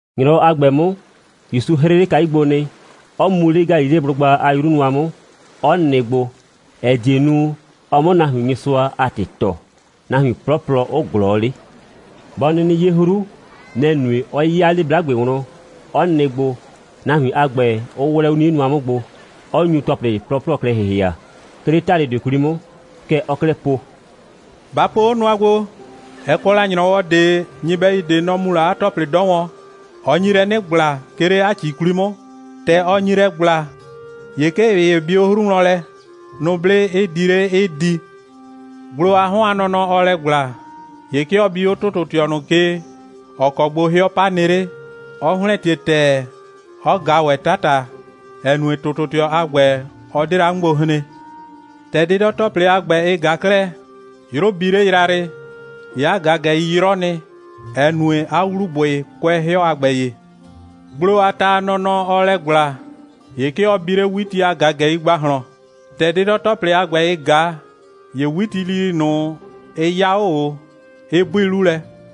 ‑Nyrɔwɔ a ‑gbɛ 'mʋ, ‑Yusu 'hrɩ 'le kayu gbo nɩ, 'ɔ mu 'le Galileblʋgba a 'yru nʋa 'mʋ, 'ɔ nɩ gbo, ‑ɛ die nu, ɔ 'mʋ nahuin Nyɩsʋa a ‑tɩ tɔɔ, nahuin 'plɔplɔ 'ʋ ꞊glɔɔ 'le. Bɔ 'nɩnɩ 'ye 'hru, nɛ‑ nue, 'ɔ 'ya 'le 'blagbe wlɔn, 'ɔ nɩ gbo, nahuin a ‑gbɛ 'ʋ 'wlɛ 'o 'nie nʋa 'mʋ gbo, 'ɔ nyu ‑tɔplɩ 'plɔplɔ klɛ ‑hɩhɩa, 'ke 'le ‑talʋdʋɩ 'kwli 'mʋ. Kɛ ɔɔ 'klɛɛ po: «Ba po 'o nʋa gbo. Ɛ kɔ la ‑nyrɔwɔ ꞊de, nyɩbɛyu ꞊de 'ɔ mu la 'a ‑tɔplɩ 'dɔ wɔn. Ɔ nyi lɛ 'nɩ ‑gbla, 'ke 'le 'a ‑ci 'kwli 'mʋ. ‑Tɛ ɔ nyi lɛ ‑gbla, ‑ye 'ke ꞊ɩ ‑ye bi 'o 'hru wlɔn lɛ, nʋblɩ 'ɩ di 'le, 'ɩ di. Gblo a 'hɔn a nɔnɔ, ɔɔ lɛ ‑gbla, ‑ye 'ke ɔ bi 'o ‑tʋtʋtɩɔ ꞊nʋ ke, ‑ɔ kɔ gbo 'hɩɔ 'pa nɩ 'le, 'ɔ ‑hlɛntie ‑tɛɛ, 'ɔ ꞊ga ‑wɛ 'tata, ‑ɛ nue, ‑tʋtʋtɩɔ a ‑gbɛ, ɔ 'de la 'mʋ gbo hren. ‑Tɛ 'dɩdɔ‑tɔplɩ a ‑gbɛ, ɩ ꞊ga 'klɛɛ, 'yrʋ bi 'le yrayrɩ, ‑ye 'a ꞊gagɛi 'yrɔ nɩ, ‑ɛ nue, 'a ‑wlubʋɩ kʋɛ 'hɩɔ a ‑gbɛ ye. Gblo a ta a nɔnɔ, ɔɔ lɛ ‑gbla, ‑ye 'ke ɔ bi 'le 'witi a ꞊gagɛi ‑gbahlɔn. ‑Tɛ 'dɩdɔ‑tɔplɩ a ‑gbɛ, ɩ ꞊ga, ‑ye 'witilili ꞊nʋ, ɩ 'ya 'o ꞊o, 'ɩ 'bui 'lu lɛ.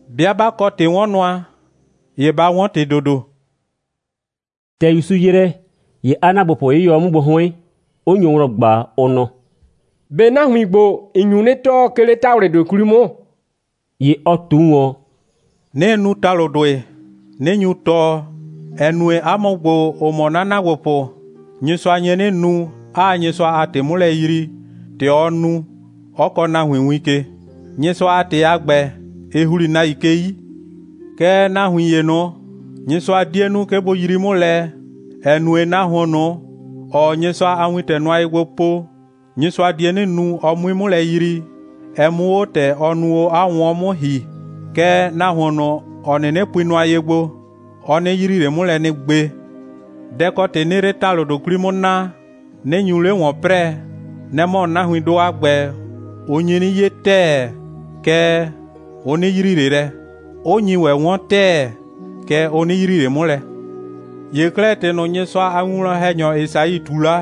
'Bɩa 'ba kɔ ‑tɩ'wɔnnʋa, ‑ye ba 'wɔn ‑tɩ ‑dodo.» ‑Tɛ ‑Yusu ‑yrɛ, ‑ye 'a ‑naagbopʋ 'yɩyɔ 'o 'mʋ gbo 'hʋɩn, 'ʋ nyo wlɔn ꞊gba, ʋ nɔ: «꞊Be nahuin ‑gbo, ‑n nyu 'nɩ tɔɔ, 'ke 'le ‑talʋdʋɩ 'kwli 'mʋ?» ‑Ye ɔ ꞊tu ꞊wɔn: «'Nɩɩ nu ‑talʋdʋɩ, 'nɩ nyu tɔɔ, ‑ɛ nue, 'a mʋ ‑gbo, ‑ʋ mɔ 'na ‑naagbopʋ, Nyɩsʋa nye 'nɩ nu, 'aa Nyɩsʋa a ‑tɩ 'mʋ lɛ yrii, ‑tɛ ɔɔ nu, 'ɔ kɔɔ nahuin win ke. Nyɩsʋa a ‑tɩ a ‑gbɛ, ɩ ‑hli nahuin ke 'yi. Kɛɛ, nahuin ‑ye ꞊nʋ, Nyɩsʋa 'die nu, 'ke bʋ yrii 'mʋ lɛ, ‑ɛ nue, nahuon ꞊nʋ, ‑ɔɔ Nyɩsʋa a wintɛ nʋa ye gbo po, Nyɩsʋa die 'nɩ nu, ɔ 'mui 'mʋ lɛ yrii, ɛ 'mʋ 'o ‑tɛ ɔ nu o 'a 'wʋnwɔn 'mʋ ‑hi. Kɛɛ, nahuon ꞊nʋ, ‑ɔ 'nɩnɩ pui nʋa ye gbo, ɔ 'nɩ yrii ꞊le 'mʋ lɛ nɩ gbe. Dɛ ‑kɔ ‑tɩ 'nɩɩ 'le ‑talʋdʋɩ 'kwli 'mʋ naa, 'nɩ nyu 'le ‑wɔn 'prɛɛ, nɛ‑ mɔ, nahuindʋ a ‑gbɛ, ʋ nyi 'nɩ 'ye ‑tɛɛ, kɛɛ, ʋ 'nɩ yrii ꞊le lɛ, 'ʋ nyi ‑wɛ 'wɔn ‑tɛɛ, kɛɛ, ʋ 'nɩ yrii ꞊le 'mʋ lɛ. ‑Ye 'klɛɛ, ‑tɩ ꞊nʋ, Nyɩsʋa a winwlɔn‑hɛnyɔ Esai ꞊tu la,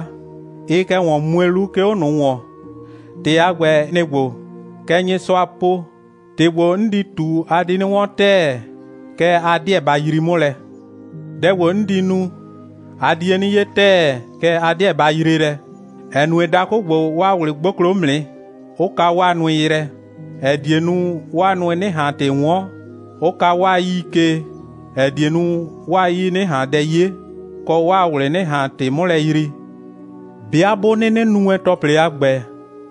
ɩɩ kɛ ‑wɔn mue 'lu, 'ke 'o ꞊nʋ ‑wɔn. ‑Tɩ a ‑gbɛ, nɩ‑ ‑gbo: Kɛ Nyɩsʋa po: ‑Tɩ ‑gbo, 'n di ꞊tu, a di 'nɩ 'wɔn ‑tɛɛ, kɛɛ, a 'deɛ ba yrii 'mʋ lɛ; dɛ ‑gbo, 'n di nu, a die 'nɩ 'ye ‑tɛɛ, kɛɛ, a 'deɛ ba yree lɛ, ‑ɛ nue, dakʋ ‑gbo, 'waa ꞊wlɩ 'gboklo 'mʋ nɩ, 'ʋ ka 'waa nʋɩ yrɛ, ‑ɛ die nu, 'waa nʋɩ 'nɩ ꞊han ‑tɩ 'wɔn, 'ʋ ka 'waa 'yii ke, ‑ɛ die nu, 'waa 'yii 'nɩ ꞊han dɛ 'ye, kɔ, 'waa ꞊wlɩ 'nɩ ꞊han ‑tɩ 'mʋ lɛ yrii. 'Bɩa 'bʋ 'nɩnɩ nu wɛn ‑tɔplɩ a ‑gbɛ,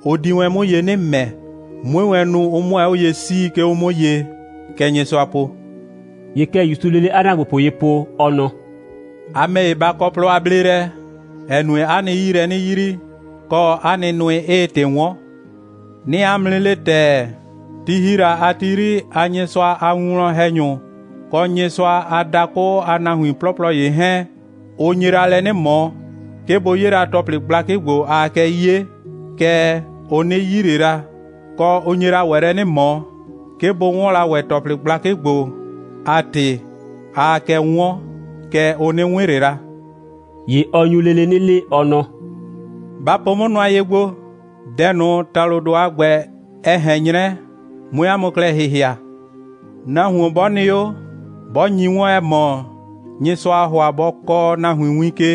ʋ di wɛn 'mʋ ye 'nɩ ‑mɛ, 'mue wɛn nu, ʋ 'mʋ 'o ye 'sii, 'ke 'o 'mʋ ye. Kɛ Nyɩsʋa po.» ‑Ye kɛ ‑Yusuu lele 'a ‑naagbopʋ ye po, ɔ nɔ: «A ‑mɛ ‑ye, ba kɔ plɔ a bleelɛ, ‑ɛ nue, 'a nɩ 'yii lɛ 'nɩ yrii, kɔ, 'a nɩ nʋɩ 'ɩɩ ‑tɩ 'wɔn. 'Nɩɩ 'a mʋ 'nɩ le ‑tɛɛ, ti ‑hi la a ti 'yri a Nyɩsʋa a winwlɔn‑hɛnyʋ kɔ Nyɩsʋa a dakʋ a nahuin 'plɔplɔ ‑ye 'hɛɛn, ʋ nye la lɛ 'nɩ ꞊mɔ, 'ke bʋ 'ye la ‑tɔplɩ gblakɩ ‑gbo, aa kɛ 'ye, kɛɛ, ʋ 'nɩ 'yi ꞊le la, kɔ, ʋ nye la ‑wɛ lɛ 'nɩ ꞊mɔ, 'ke bʋ 'wɔn la ‑wɛ ‑tɔplɩ gblakɩ ‑gbo a ‑tɩ, aa kɛ 'wɔn, kɛɛ, ʋ 'nɩ 'wɩn ꞊le la.» ‑Ye ɔ nyu lele 'nɩ le, ɔ nɔ: «Ba po 'mʋ nʋa ye gbo, dɛ ꞊nʋ, ‑talʋdʋ a ‑gbɛ, ɛ ꞊hɛn 'nyrɛ, 'mue 'a mʋ klɛ ‑hɩhɩa. Nahuon 'bɔ nɩ 'o, 'bɔ nyi 'wɔn, ‑ɛ mɔ, Nyɩsʋaa ‑hʋa bɔ kɔɔ nahuin win ke,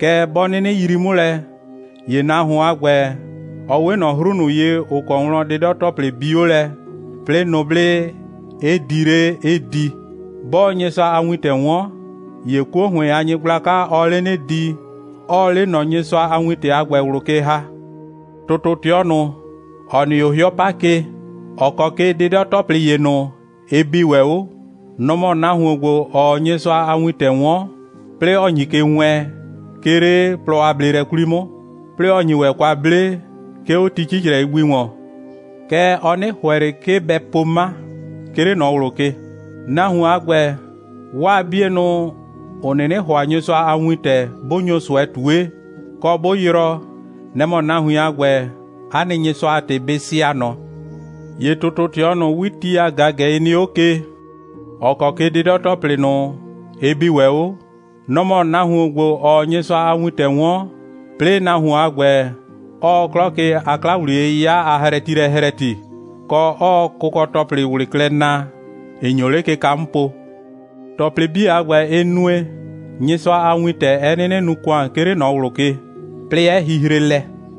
kɛɛ, 'bɔ 'nɩnɩ yrii 'mʋ lɛ, ‑ye nahuon a ‑gbɛ, ɔ 'we ꞊nɔ 'hru ꞊nʋ ye, ‑ʋ kɔ wlɔn 'dɩdɔ‑tɔplɩ bi 'o lɛ, 'plɩɩ nʋblɩ 'ɩ di 'le, 'ɩ di. 'Bɔɔ Nyɩsʋa a wintɛ 'wɔn, ‑ye 'kuo ‑hʋɩn a nyɩgblaka, ɔɔ 'le 'nɩ di, 'ɔɔ 'le ꞊nɔ Nyɩsʋa a wintɛ a ‑gbɛ ꞊wlʋ ke ‑ha. ‑Tʋtʋtɩɔ ꞊nʋ, ‑ɔ nɩ 'o 'hɩɔ 'pa ke, ‑ɔ kɔ ke 'dɩdɔ‑tɔplɩ ‑ye ꞊nʋ, ɩ bi ‑wɛ 'o, nɔ‑ mɔ nahuon ‑gbo, ‑ɔɔ Nyɩsʋa a wintɛ 'wɔn, 'plɩɩ ‑ɔ nyi ke wɛɛn, 'ke 'le plɔ a bleelɛ 'kwli 'mʋ, 'plɩɩ ‑ɔ nyi ‑wɛ kwa 'ble, 'ke 'o ti 'cicrɛi gbi ‑wɔn. Kɛɛ, ɔ 'nɩ ‑hʋɛ ꞊le, 'ke bɛ po 'ma, 'ke 'le ꞊nɔ ꞊wlʋ ke. Nahuon a ‑gbɛ, 'waa 'bienʋ, ‑ʋ 'nɩnɩ ‑hʋa Nyɩsʋa a wintɛ, 'bʋ nyo ꞊sʋɛ ꞊tue, kɔ, 'bʋ yrɔɔ, nɛ‑ mɔ nahuin a ‑gbɛ, 'a nɩ Nyɩsʋa a ‑tɩ bɩ sɩa ꞊nɔ. ‑Ye ‑tʋtʋtɩɔ ꞊nʋ, 'witi a ꞊gagɛi nɩ 'o ke, ‑ɔ kɔ ke 'dɩdɔ‑tɔplɩ ꞊nʋ, ɩ bi ‑wɛ 'o, nɔ‑ mɔ nahuon ‑gbo, ‑ɔɔ Nyɩsʋa a wintɛ 'wɔn, 'plɩɩ nahuon a ‑gbɛ, 'ɔɔ 'klɔ ke a 'kla‑wliye'yɩya a hrɛtilɛ hrɛti, kɔ, 'ɔɔ kʋkɔ‑tɔplɩ ꞊wlɩ klɛ naa, ‑ɩ nyo 'le kɩka 'mʋ po. ‑Tɔplɩ 'bii a ‑gbɛ, ɩ nue, Nyɩsʋa a wintɛ 'ɛ 'nɩnɩ nu ‑kʋan, 'ke 'le ꞊nɔ ꞊wlʋ ke, 'plɩɩ 'ɛ hihre lɛ.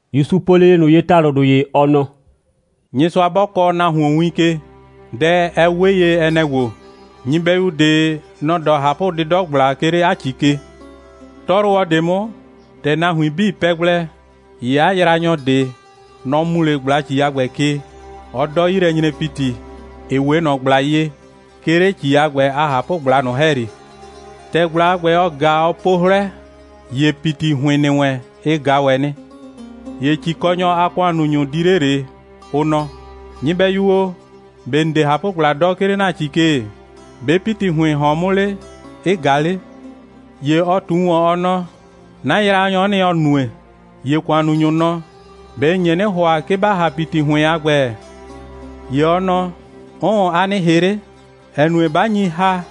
‑Yusu po lele ꞊nʋ ye ‑talʋdʋ ‑ye, ɔ nɔ: «Nyɩsʋa 'bɔ kɔɔ nahuon win ke, dɛ, ɛ 'we ye, ɛ nɛ‑ ‑gbo: Nyɩbɛyu ꞊de, nɔ‑ 'dɔ ꞊hapʋ'dɩdɔ꞊gbla, 'ke 'le 'a ‑ci ke. 'Tɔyrʋwɔ ꞊de 'mʋ, ‑tɛ nahuin 'bii pɛ gblɛ, ‑ye 'a yraanyɔ ꞊de, nɔ‑ mu 'le ꞊gbla‑ci a ‑gbɛ ke, 'ɔ 'dɔ 'yilɛnyre‑piti, ‑ɩ 'we ꞊nɔ ꞊gbla ye, 'ke 'le 'a ‑ci a ꞊hapʋgbla ꞊nʋ ‑hɛyri. ‑Tɛ ꞊gbla a ‑gbɛ, ɔ ꞊ga, ɔ po 'hlɛ, ‑ye ‑piti ‑hʋɩn ‑nɩ wɛn, ɩ ꞊ga ‑wɛ nɩ. ‑Ye ‑cikɔnyɔ a ‑kʋannunyʋ, ʋ di 'le ꞊le, ʋ nɔ: Nyɩbɛyu o, ꞊be ‑n 'de ꞊hapʋgbla 'dɔ, 'ke 'le ‑na ‑ci ke? ‑Be' ‑piti ‑hʋɩn ‑hɔn 'mʋ 'le, 'ɩ ꞊ga 'le? ‑Ye ɔ ꞊tu ‑wɔn, ɔ nɔ: 'Na yraanyɔ'ɔ nɩ, ‑ɔ nue. ‑Ye ‑kʋannunyʋ nɔ: ꞊Be ‑n nye 'nɩ ‑hʋa, 'ke ‑ba ‑ha ‑piti ‑hʋɩn a ‑gbɛ? ‑Ye ɔ nɔ: 'Ʋʋn, a nɩ ‑hɩ 'le, ‑ɛ nue, 'ba nyi ‑ha,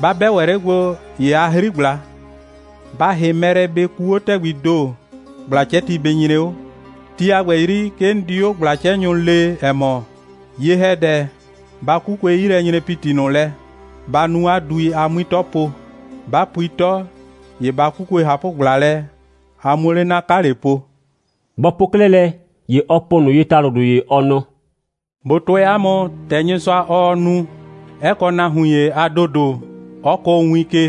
'ba 'bɛ ‑wɛ 'le gbo, ‑ye a 'hri ꞊gbla. Ba ‑hɩ mɛ lɛ, bɩ kuu 'o ‑tɛgbii ‑do, ꞊gbla'cɛti bɩ nyre 'o. Ti a ‑gbɛ 'yri, 'ke 'n di 'o ꞊gbla'cɛnyʋ lee, ‑ɛ mɔ: Ye‑hɛdɛ, ba 'kukue 'yilɛnyre‑piti ꞊nʋ lɛ, ba nu 'a dui, a 'mui 'tɔ po. 'Ba pui 'tɔ, ‑ye ba 'kukue ꞊hapʋgbla lɛ, a 'muo 'le 'na 'kale po.» Bɔ po 'klɛɛ lɛ, ‑ye ɔ po ꞊nʋ ye ‑talʋdʋ ‑ye, ɔ nɔ: «꞊Bo tʋɛ 'a mʋ, ‑tɛ Nyɩsʋa, ɔɔ nu, 'ɛ kɔ nahuin ‑ye a ‑dodo, 'ɔ kʋʋ win ke,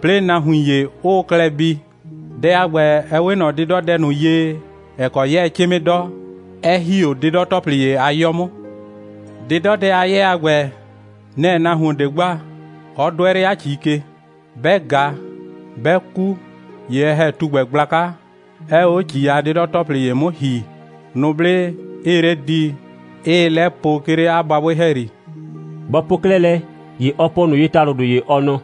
'plɩɩ nahuin ‑ye 'ʋʋ klɛ bii. Dɛ a ‑gbɛ, ɛ 'we ꞊nɔ 'dɩdɔdɛ ꞊nʋ ye, ‑ɛ kɔ 'yɛɛ 'cɩmɩ 'dɔ, 'ɛ ‑hi 'o 'dɩdɔ‑tɔplɩ ‑ye a 'yɔ 'mʋ. 'Dɩdɔdɛ a 'yɛɛ a ‑gbɛ, nɛ‑ nahuon ꞊de gba, 'ɔ 'dʋɛ 'le 'a ‑ci ke. 'Bɛ ꞊ga, 'bɛ ku, ‑ye ɛ ‑hɛ tugbɛ gblaka, 'ɛɛ 'o ‑ci a 'dɩdɔ‑tɔplɩ ‑ye 'mʋ ‑hi, nʋblɩ 'ɩɩ 'le di, 'ɩɩ 'lɛ po, 'ke 'le 'a babʋɩ ‑hɛyri.» Bɔ po 'klɛɛ lɛ, ‑ye ɔ po ꞊nʋ ye ‑talʋdʋ ‑ye, ɔ nɔ: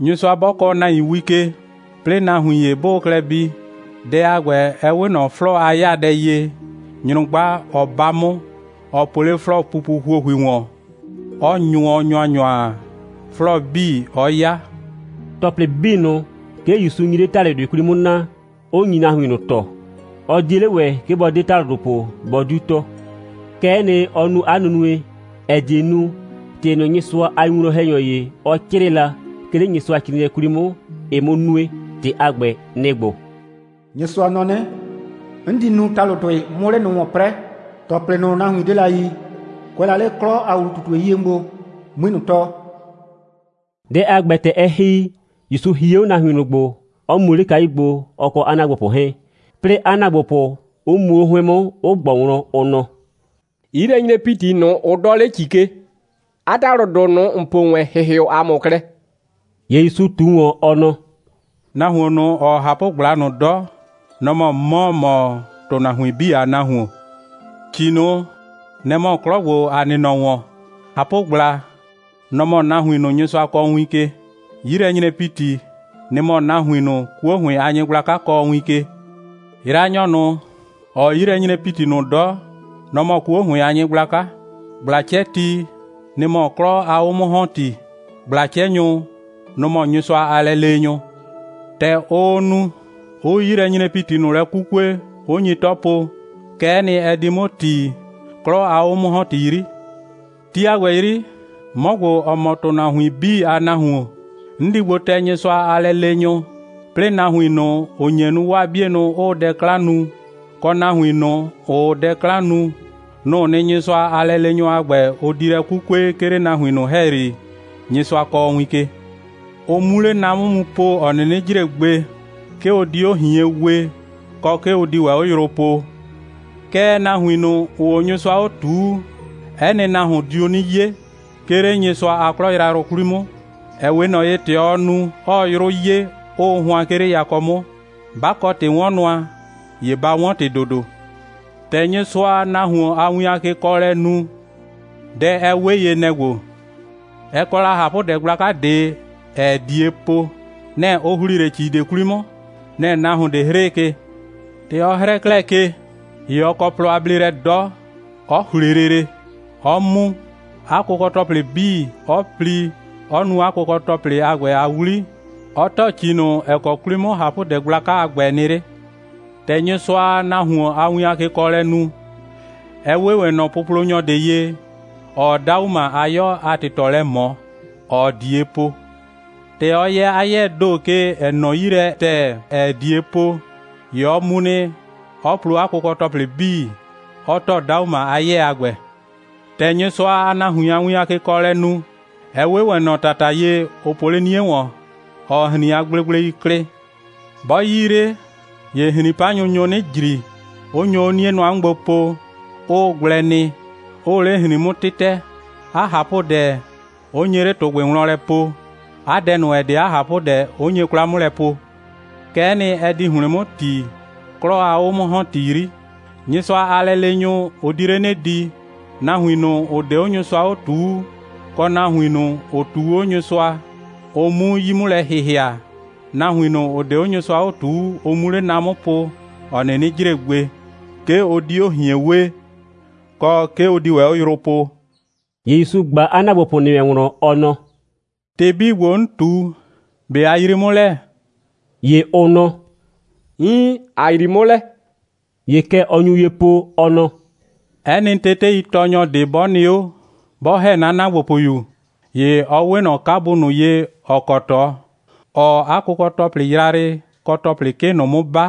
«Nyɩsʋa 'bɔ kɔɔ nahuin win ke, 'plɩɩ nahuin ‑ye 'bʋʋ klɛ bii, dɛ a ‑gbɛ, ɛ 'we ꞊nɔ 'flɔɔ a 'yaadɛ ye, nyrʋgba, ɔ 'ba 'mʋ, ɔ po 'le 'flɔɔpupu ‑huohui ‑wɔn, 'ɔ nyʋɔ ‑nyʋanyʋa, 'flɔɔ 'bii 'ɔ 'ya.» ‑Tɔplɩ 'bii ꞊nʋ, 'ke ‑Yusu nyi 'le ‑talʋdʋɩ 'kwli 'mʋ naa, 'ʋ nyi nahuin ꞊nʋ tɔɔ. Ɔ 'die 'le ‑wɛ, 'ke bɔ 'de ‑talʋdʋ po, bɔ 'diu tɔɔ. Kɛ'ɛ nɩ, ɔ nu 'a nunue, ‑ɛ die nu, ‑tɩ ꞊nʋ Nyɩsʋa a winwlɔn‑hɛnyɔ ‑ye, ɔ 'crɩɩ la, 'ke 'le Nyɩsʋacrɩɩnɩɛ 'kwli 'mʋ, ɛ 'mʋ nue. ‑Tɩ a ‑gbɛ, nɩ‑ ‑gbo: «Nyɩsʋa nɔ 'nɩ: 'N di nu ‑talʋdʋɩ, 'mʋ 'le ꞊nʋ ‑wɔn 'prɛɛ. ‑Tɔplɩ ꞊nʋ, nahuin 'de la yi, kʋɛ la 'le 'klɔ a ‑wlu꞊tutue 'yie 'mʋ gbo, 'mui ꞊nʋ tɔɔ.» Dɛ a ‑gbɛ, ‑tɛ ɛ ‑hi, ‑Yusu hie 'o nahuin ꞊nʋ gbo, 'ɔ mu 'le kayu gbo, ɔ kɔ 'a ‑naagbopʋ 'hɛɛn, 'plɩɩ 'a ‑naagbopʋ 'ʋ muo 'o 'hʋɩn 'mʋ, 'ʋ ꞊gbɔ wlɔn, ʋ nɔ: «'Yilɛnyre‑piti ꞊nʋ, ʋ 'dɔɔ 'le ‑ci ke, 'a ‑talʋdʋ ꞊nʋ, ‑n po wɛn, ‑hɩhɩʋ ‑a mʋ klɛ.» ‑Ye ‑Yusu ꞊tu ‑wɔn, ɔ nɔ: «Nahuon ꞊nʋ, ‑ɔɔ ꞊hapʋgbla ꞊nʋ 'dɔ, nɔ‑ mɔ 'mɔ, ‑ɔ mɔ ‑tʋnahuin 'bii a Nahuon. ‑Ci ꞊nʋ, nɛ‑ mɔ 'klɔ ‑gbo, ‑a nɩ nɔ ‑wɔn. ꞊Hapʋgbla, nɔ‑ mɔ nahuin ꞊nʋ, Nyɩsʋa kɔɔ win ke. 'Yilɛnyre‑piti, nɩ‑ mɔ nahuin ꞊nʋ, 'kuo ‑hʋɩn a nyɩgblaka kɔɔ win ke. Yraanyɔ ꞊nʋ, ‑ɔɔ 'yilɛnyre‑piti ꞊nʋ 'dɔ, nɔ‑ mɔ 'kuo ‑hʋɩn a nyɩgblaka. ꞊Gbla'cɛti, nɩ‑ mɔ 'klɔ a 'o'mʋ‑hɔnti. ꞊Gbla'cɛnyʋ, nʋ‑ mɔ Nyɩsʋa a lɛleenyʋ. ‑Tɛ ʋʋ nu, 'ʋʋ 'yilɛnyre‑piti ꞊nʋ lɛ 'kukue, 'ʋ nyi 'tɔ po, kɛ'ɛ nɩ, ɛ di 'mʋ ‑ti, 'klɔ a 'o'mʋ‑hɔnti 'yri. Ti a ‑gbɛ 'yri, 'mɔ ‑gbo, ‑ɔ mɔ ‑tʋnahuin 'bii a Nahuon, 'n di gbo tɛ Nyɩsʋa a lɛleenyʋ, 'plɩɩ nahuin ꞊nʋ, ‑ʋ nye nu, 'waa 'bienʋ 'ʋʋ dɛ 'klan nu, kɔ nahuin ꞊nʋ, ‑ʋʋ dɛ 'klan nu, nʋ‑ʋ nɩ, Nyɩsʋa a lɛleenyʋ a ‑gbɛ, ʋ di lɛ 'kukue, 'ke 'le nahuin ꞊nʋ ‑hɛyri, Nyɩsʋa kɔɔ win ke, ʋ 'mu 'le na ꞊nʋ 'mʋ po, ‑ɔ 'nɩnɩ jre gbe. 'Ke ʋ di 'o ꞊hien wee, kɔ, 'ke ʋ di ‑wɛ 'o yrʋ poo. Kɛɛ, nahuin ꞊nʋ, ‑ʋʋ 'o Nyɩsʋa 'o ꞊tuu, 'ɛ nɩ nahuon diu 'nɩ 'ye, 'ke 'le Nyɩsʋa a 'klɔ yrayrʋ 'kwli 'mʋ, ‑ɛ 'we ꞊nɔ ye, ‑tɛ ɔɔ nu, 'ɔɔ 'yrʋ 'ye, ‑ʋʋ hʋan, 'ke 'le yakɔ 'mʋ. 'Ba kɔ ‑tɩ'wɔnnʋa, ‑ye ba 'wɔn ‑tɩ ‑dodo.» «‑Tɛ Nyɩsʋaa nahuon a win a kekɔɔlɛ nu, dɛ, ɛ 'we ye, nɛ‑ ‑gbo: Ɛ kɔ la ꞊hapʋdɛ gblaka ꞊de, ‑ɛɛ ꞊die po. Nɛ‑ ʋ ‑hlii 'le ‑ci ꞊de 'kwli 'mʋ. Nɛ‑ nahuon ꞊de 'hrɩɩ ke. ‑Tɛ ɔ 'hrɛɛ 'klɛɛ ke, ‑ye ɔ kɔ plɔ a bleelɛ 'dɔ, 'ɔ ‑hle lele, 'ɔ mu, 'a kʋkɔ‑tɔplɩ 'bii, 'ɔ pli, 'ɔ nu 'a kʋkɔ‑tɔplɩ a ‑gbɛ a 'wli, 'ɔ ‑tɔ ‑ci ꞊nʋ, ‑ɛ kɔ 'kwli 'mʋ ꞊hapʋdɛ gblaka a ‑gbɛ nɩ 'le.» «‑Tɛ Nyɩsʋaa nahuon a win a kekɔɔlɛ nu, ɛ 'we ‑wɛ ꞊nɔ puplonyɔ ꞊de ye, ‑ɔɔ 'dauma a 'yɔ a ‑tɩtɔ lɛ ꞊mɔ, ‑ɔɔ ꞊die po. ‑Tɛ ɔ yɛ 'a 'yɛɛ ‑do ke, ‑ɛ nɔ 'yi lɛ ‑tɛɛ, ‑ɛɛ ꞊die po, ‑ye ɔ mu nɩ, 'ɔ plo 'a kʋkɔ‑tɔplɩ 'bii, 'ɔ ‑tɔ 'dauma a 'yɛɛ a ‑gbɛ.» «‑Tɛ Nyɩsʋaa nahuin a win a kekɔɔlɛ nu, ɛ 'we ‑wɛ ꞊nɔ ‑tata ye, ʋ po 'le 'nie ‑wɔn, ‑ɔɔ ‑hrin a gblegblei klɩ. 'Bɔ 'yii 'le, ‑ye ‑hrin'panyʋ nyo 'nɩ ‑jri, 'ʋ nyo 'o 'nie nʋa 'mʋ gbo po, 'ʋʋ gblɛ nɩ, 'ʋʋ 'le ‑hrin 'mʋ 'tɩtɛ, 'a ꞊hapʋdɛ, 'ʋ nye 'le ‑tʋgbɩ wlɔn lɛ po, 'a dɛ ꞊nʋ, ‑ɛ 'de 'a ꞊hapʋdɛ, 'ʋ nye 'kwla 'mʋ lɛ po. Kɛ'ɛ nɩ, ɛ di ‑hlɩn 'mʋ ‑ti, 'klɔ a 'o'mʋ‑hɔnti 'yri: Nyɩsʋa a lɛleenyʋ, ʋ di 'le 'nɩ di, nahuin ꞊nʋ, ‑ʋ 'de 'o Nyɩsʋa 'o ꞊tuu, kɔ nahuin ꞊nʋ, ‑ʋ ꞊tuu 'o Nyɩsʋa, ʋ 'mu 'yi 'mʋ lɛ ‑hɩhɩa, nahuin ꞊nʋ, ‑ʋ 'de 'o Nyɩsʋa 'o ꞊tuu, ʋ 'mu 'le na ꞊nʋ 'mʋ po, ‑ɔ 'nɩnɩ jre gbe. 'Ke ʋ di 'o ꞊hien wee, kɔ, 'ke ʋ di ‑wɛ 'o yrʋ poo.» ‑Ye ‑Yusu ꞊gba 'a ‑naagbopʋ ‑nɩ wɛn wlɔn, ɔ nɔ: «‑Tɩ 'bii ‑gbo, 'n ꞊tu, ꞊be a yrii 'mʋ lɛ?» ‑Ye ʋ nɔ: «Iin, ‑a yrii 'mʋ lɛ.» ‑Ye kɛ ɔ nyu ye po, ɔ nɔ: «'Ɛ nɩ teteitɔɔnyɔ ꞊de, 'bɔ nɩ 'o, 'bɔ ‑hɛ 'na ‑naagbopʋyu, ‑ye ɔ 'we ꞊nɔ 'kabu ꞊nʋ ye, ‑ɔ kɔ ꞊tɔ, ‑ɔɔ 'a kʋkɔ‑tɔplɩ yrayrɩ kɔ ‑tɔplɩ 'kɩ ꞊nʋ 'mʋ 'ba,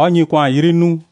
‑ɔ nyi ‑kʋan 'yri nuu.»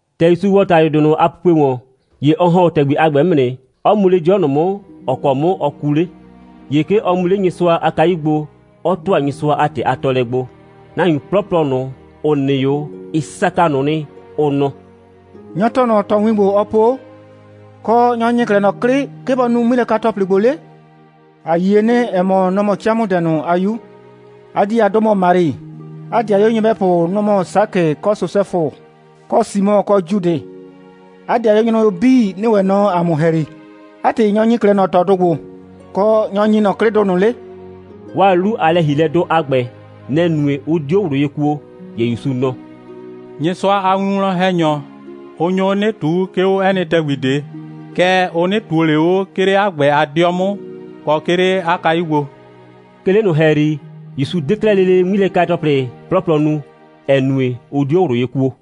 ‑Tɛ ‑Yusu ‑wɔ ‑talʋdʋɩ ꞊nʋ a pupue ‑wɔn, ‑ye ɔ ‑hɔn 'o ‑tɛgbi a ‑gbɛ 'mʋ nɩ, 'ɔ mu 'le 'dɩɔ ꞊nʋ 'mʋ, ‑ɔ kɔ 'mʋ ɔ kuu 'le. ‑Ye 'ke ɔ mu 'le Nyɩsʋa a kayu gbo, 'ɔ ‑tʋa Nyɩsʋa a ‑tɩ a tɔɔlɛ gbo. Nahuin 'plɔplɔ ꞊nʋ, ‑ʋ nɩ 'o, ɩ saka ꞊nʋ nɩ, ʋ nɔ: «Nyɔ‑ tɔɔ ꞊nɔ ꞊tɔwin ‑gbo, ɔɔ po? Kɔ, nyɔ‑ ‑nyi 'klɛɛ ꞊nɔ 'klɩ, 'ke bɔ nu 'ŋmilɛka‑tɔplɩ ‑gbo 'le? ‑A yie nɩ, ‑ɛ mɔ, nɔ‑ mɔ 'camʋdɛ ꞊nʋ a 'yu. 'A 'dii a 'dʋ mɔ Mari. 'A ‑dɩayuo nyɩbɛpʋ, nʋ‑ mɔ Sakɩ, kɔ Sosɛfʋ, kɔ Simɔ, kɔ Judɩ. 'A ‑dɩayuo nyrʋyuo 'bii nɩ ‑wɛ nɔ ‑a mʋ ‑hɛyri. 'A ‑tɩ, nyɔ‑ ‑nyi 'klɛɛ ꞊nɔ ꞊tɔdʋ ‑gbo, kɔ, nyɔ‑ ‑nyi ꞊nɔ 'klɩdʋ ꞊nʋ 'le?» 'Waa 'lu a lɛ‑hielɛdʋ a ‑gbɛ, nɛ‑ nue, 'ʋ 'dio ꞊wlʋ ye kuo. ‑Ye ‑Yusu nɔ: «Nyɩsʋa a winwlɔn‑hɛnyɔ, ʋ nyo 'o 'nɩ ꞊tuu, 'ke 'o 'ɛ nɩ ‑tɛgbi ꞊de. Kɛɛ, ʋ 'nɩ ꞊tuo ꞊le 'o, 'ke 'le 'a ‑gbɛ a 'dɩɔ 'mʋ, kɔ, 'ke 'le 'a kayu gbo.» 'Ke 'le ꞊nʋ ‑hɛyri, ‑Yusu 'de 'klɛɛ lele 'ŋmilɛka‑tɔplɩ 'plɔplɔ nu, ‑ɛ nue, ʋ 'dio ꞊wlʋ ye kuo.